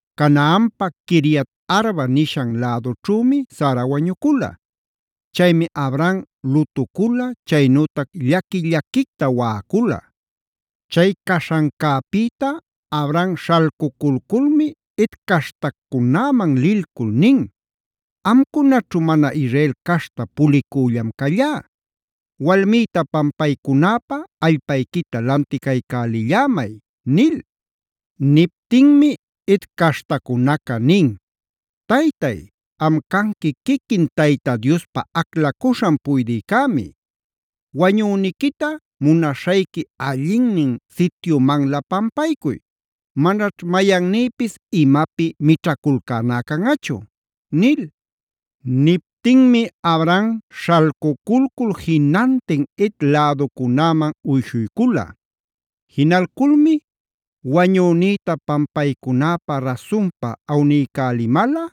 Canaanpa Quiriat-arba (Hebron) nishan lädućhümi Sara wañucula. Chaymi Abraham lutucula, chaynütac llaqui-llaquicta waꞌacula. Chay caśhancäpïta Abraham śhalcuculculmi Het caśhtacunäman lilcul nin: “Amcunaćhu mana Israel caśhta pulicüllam callá.a Walmïta pampaycunäpä allpayquita lanticaycälillämay”b nil. Niptinmi Het caśhtacunaca nin: “Taytay, am canqui quiquin Tayta Diospa aclacuśhan puydïcämi. Wañüniquita munaśhayqui allinnin sityumanlä pampaycuy. Manaćh mayannïpis imapi mićhaculcäná canꞌachu” nil. Niptinmi Abraham śhalcuculcul jinantin Het läducunäman uyshuycula. Jinalculmi: “Wañünïta pampaycunäpä rasunpa awniycälimalꞌa,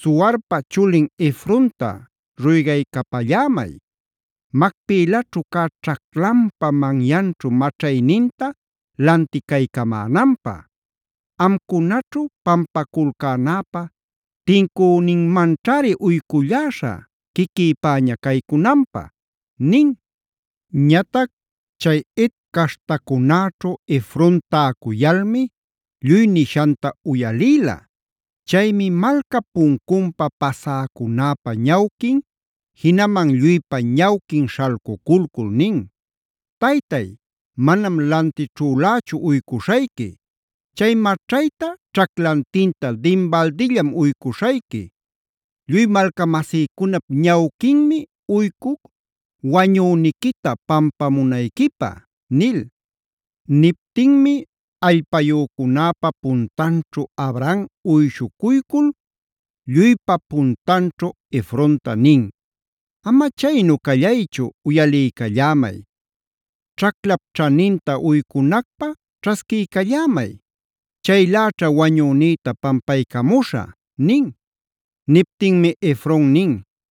Zoharpa chulin Efronta ruygaycapallämay, Macpelaćhu cä ćhaclanpa manyanćhu maćhayninta lanticaycamänanpä. Amcunaćhu pampaculcänäpä tincüninmanćhari uyculläśha quiquïpäña caycunanpä” nin. Ñatac chay Het caśhtacunäćhu Efron täcuyalmi lluy nishanta uyalïla. Chaymi malcap puncunpa pasäcunäpa ñawquin, jinaman lluypa ñawquin śhalculcul nin: “Taytay, manam lantićhülächu uycuśhayqui. Chay maćhayta ćhaclantinta dinbaldillam uycuśhayqui. Lluy malcamasïcunap ñawquinmi uycuc wañüniquita pampamunayquipä” nil. Niptinmi allpayücunäpa puntanćhu Abraham uyshuycul, lluypa puntanćhu Efronta nin: “Ama chaynu callaychu uyaliycallämay. Ćhaclap ćhaninta uycunacpä ćhasquiycallämay. Chayläćha wañünïta pampaycamuśhä” nin. Niptinmi Efron nin: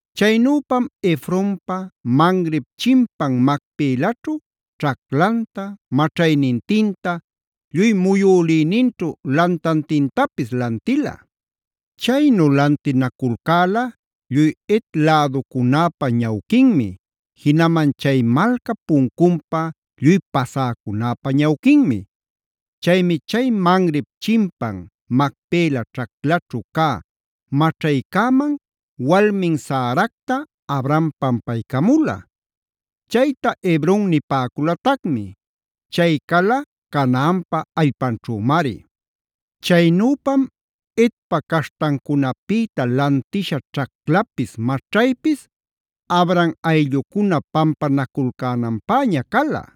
Chaynüpam Efronpa Mamrep chimpan Macpelaćhu ćhaclanta, maćhaynintinta, lluy muyülïninćhu lantantintapis lantila. Chaynu lantinaculcäla lluy Het läducunäpa ñawquinmi, jinaman chay malcap puncunpa lluy pasäcunäpa ñawquinmi. Chaymi chay Mamrep chimpan Macpela ćhaclaćhu cä maćhaycäman walmin Saracta Abraham pampaycamula. Chayta Hebron nipäculatacmi. Chay cala Canaanpa allpanćhümari. Chaynüpam Hetpa caśhtancunapïta lantisha ćhaclapis maćhaypis Abraham ayllucuna pampanaculcänanpäña cala.